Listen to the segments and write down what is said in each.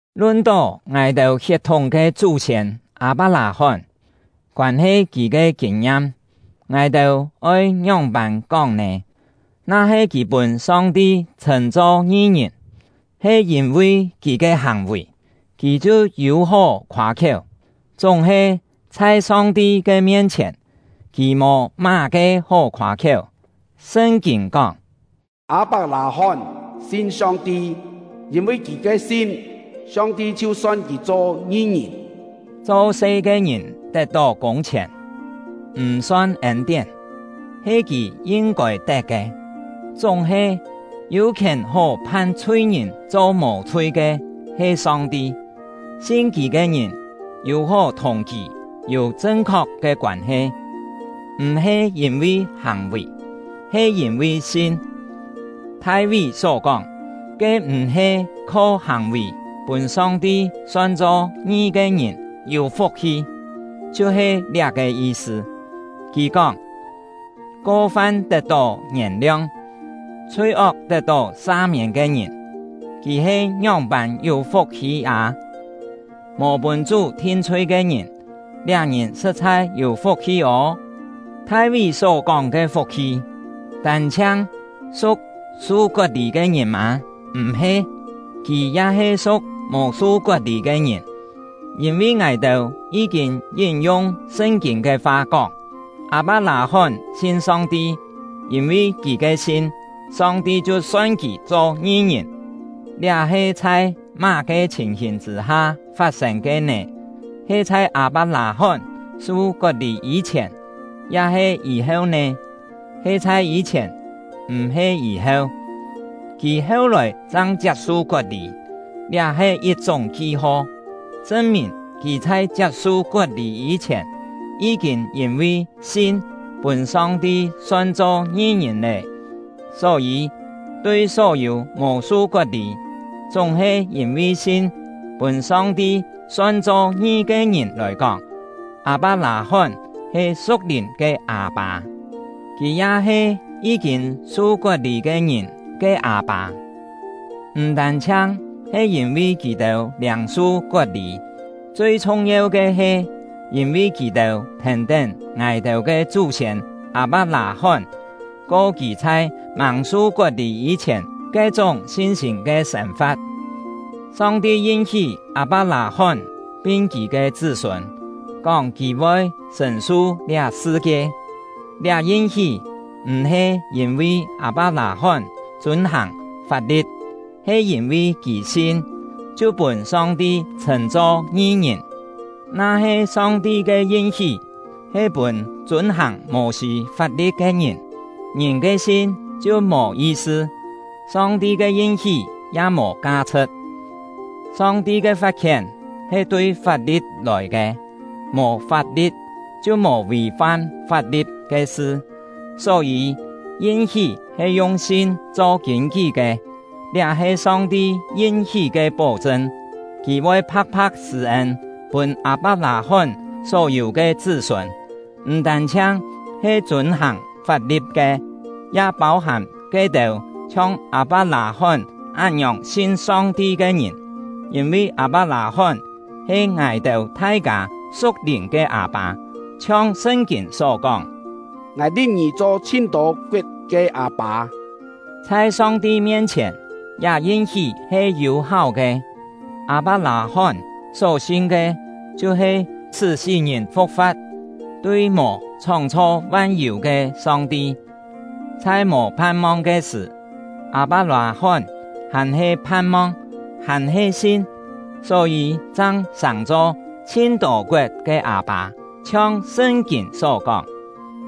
Lun-tó ngài-têu hiet-thúng ke chú-siên Â-pak-lâ-hón, koân-he kì ke kîn-ngiam, ngài-têu oi ngióng-pân kóng nè? Na-he kì pûn Song-ti chhṳ̂n-cho ngi-ngìn he yîn-vi kì ke hàng-vì, kì chhiu yû-hó khoâ-khiéu; chúng-he, chhai Song-ti ke mien-chhièn, kì mò má-ke hó khoâ-khiéu. Sṳn-kîn kóng: “Â-pak-lâ-hón sin Song-ti, yîn-vi kì ke sin, Song-ti chhiu son kì cho ngi-ngìn.” Cho-se ke ngìn tet-tó kûng-chhièn, m̀ son ên-tién, he kì yin-kôi tet ke. Chúng-he, yû khièn hó phan chhui-ngìn cho mò-chhui ke he Song-ti; sin Kì ke ngìn yû-hó thùng Kì yû chṳn-khok ke koân-he, m̀-he yîn-vi hàng-vì, he yîn-vi sin. Thai-ví só kóng, ke m̀-he kho hàng-vì pûn Song-ti son-cho ngi ke ngìn yû fuk-hi, chhiu-he liá-ke yi-sṳ. Kì kóng: Ko-fam tet-tó ngièn-liong, chhui-ok tet-tó sa-miên ke ngìn, kì he ngióng-pân yû fuk-hi â! Mò pûn Chú thin-chhui ke ngìn, liá ngìn sṳ̍t-chhai yû fuk-hi ô! Thai-ví só-kóng ke fuk-hi tân-chhiang su̍k su kot-lî ke ngìn mâ? M̀-he! Kì ya he su̍k mò su kot-lî ke ngìn; yîn-vi ngài-têu yí-kîn yín-yung Sṳn-kîn ke fa, kóng: “Â-pak-lâ-hón sin Song-ti, yîn-vi kì ke sin, Song-ti chhiu son kì cho ngi-ngìn.” Liá he chhai má-ke chhìn-hìn chṳ̂-ha fat-sên ke nè? He chhai Â-pak-lâ-hón su kot-lî yî-chhièn, ya-he yî-heu nè? He chhai yî-chhièn, m̀-he yî-heu. Kì heu-lòi chang chiap-su kot-lî; liá he yit-chúng ki-ho, chṳn-mìn kì chhai chiap-su kot-lî yî-chhièn yí-kîn yîn-vi sin pûn Song-ti son-cho ngi-ngìn lé. Só-yî, tui só-yû mò su kot-lî, chúng-he yîn-vi sin pûn Song-ti son-cho ngi ke ngìn lòi kóng, Â-pak-lâ-hón he su̍k-lìn ke â-pâ. Kì ya he yí-kîn su kot-lî ke ngìn ke â-pâ, m̀ tân-chhiang he yîn-vi kì-têu liâng-su kot-lî, chui chhung-yeu ke he yîn-vi kì-têu thèn-tén ngài-têu ke chú-siên Â-pak-lâ-hón, ko kì chhai màng su kot-lî yî-chhièn ke-chúng sin-sîm ke sên-fa̍t. Song-ti yin-hí Â-pak-lâ-hón pin kì ke chṳ́-sûn, kóng kì voi sṳ̀n-su liá sṳ-kie. Liá yin-hí m̀-he yîn-vi Â-pak-lâ-hón chûn-hàng fap-li̍t, he yîn-vi kì sin, chhiu pûn Song-ti chhṳ̂n-cho ngi-ngìn. Na-he Song-ti ke yin-hí he pûn chûn-hàng Mô-sî fap-li̍t ke ngìn, ngìn ke sin chhiu mò yi-sṳ, Song-ti ke yin-hí ya mò ka-chhṳ̍t. Song-ti ke fat-khién he tui fap-li̍t lòi ke; mò fap-li̍t, chhiu mò vì-fam fap-li̍t ke sṳ. Só-yî, yin-hí he yung sin cho kîn-kí ke; liá he Song-ti yin-hí ke pó-chṳn: Kì voi pha̍k-pha̍k sṳ̂-ên pûn Â-pak-lâ-hón só-yû ke chṳ́-sûn, m̀ tân-chhiang he chûn-hàng fap-li̍t ke, ya pâu-hàm ke-têu chhiong Â-pak-lâ-hón án-ngiòng sin Song-ti ke ngìn. Yîn-vi Â-pak-lâ-hón he ngài-têu thai-kâ su̍k-lìn ke â-pâ. Chhiong Sṳn-kîn só kóng: “Ngài li̍p ngì cho chhin-tô koet ke â-pâ.” Chhai Song-ti mien-chhièn, liá yin-hí he yû-háu ke; Â-pak-lâ-hón só sin ke chhiu-he sṳ́ sí-ngìn fu̍k-fa̍t, tui mò chhóng-chho van-yû ke Song-ti. Chhai mò phan-mong ke sṳ̀, Â-pak-lâ-hón hàn-he phan-mong, hàn-he sin, só-yî chang sàng-cho “chhin-tô koet ke â-pâ”. Chhiong Sṳn-kîn só kóng: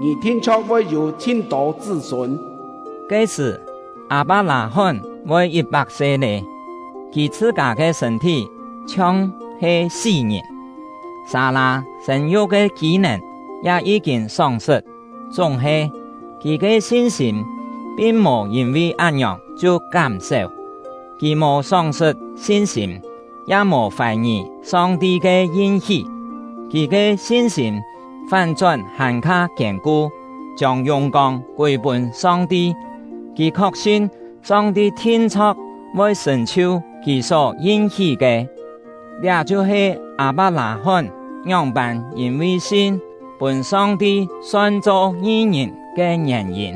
“Ngì thin-chho̍k voi yû chhin-tô chṳ́-sûn.” Ke-sṳ̀, Â-pak-lâ-hón voi yit-pak se lé. Kì chhṳ-kâ ke sṳ̂n-thí chhiong-he sí-ngìn, Sâ-lâ sên-yuk ke kî-nèn ya yí-kîn sóng-sṳt, chúng-he, kì ke sin-sîm pin mò yîn-vi án-ngiòng chhiu kám-séu. Kì mò sóng-sṳt sin-sîm, ya mò fài-ngì Song-ti ke yin-hí; kì ke sin-sîm fán-chón hàn-kha kiên-ku, chiông yùng-kông kûi pûn Song-ti. Kì khok-sin Song-ti thin-chho̍k voi sṳ̀n-chhiu Kì só yin-hí ke. Liá chhiu-he Â-pak-lâ-hón ngióng-pân yîn-vi sin “pûn Song-ti son-cho ngi-ngìn” ke ngièn-yîn.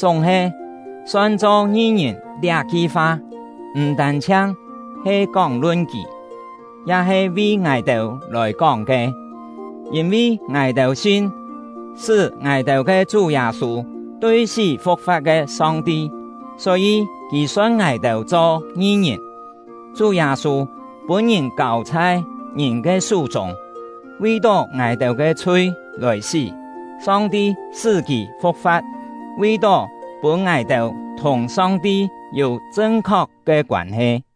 Chúng-he, “son-cho ngi-ngìn” liá-ki fa, m̀ tân-chhiang he kóng-lun kì, ya he vi ngài-têu lòi kóng ke. Yîn-vi ngài-têu sin sṳ́ ngài-têu ke Chú Yâ-sû tui sí fu̍k-fa̍t ke Song-ti, só-yî Kì son ngài-têu cho ngi-ngìn. Chú Yâ-sû pûn-ngìn kâu chhai ngìn ke sú-chûng, vi-tó ngài-têu ke chhui lòi sí; Song-ti sṳ́ kì fu̍k-fa̍t, vi-tó pûn ngài-têu thùng Song-ti yû chṳn-khok ke koân-he.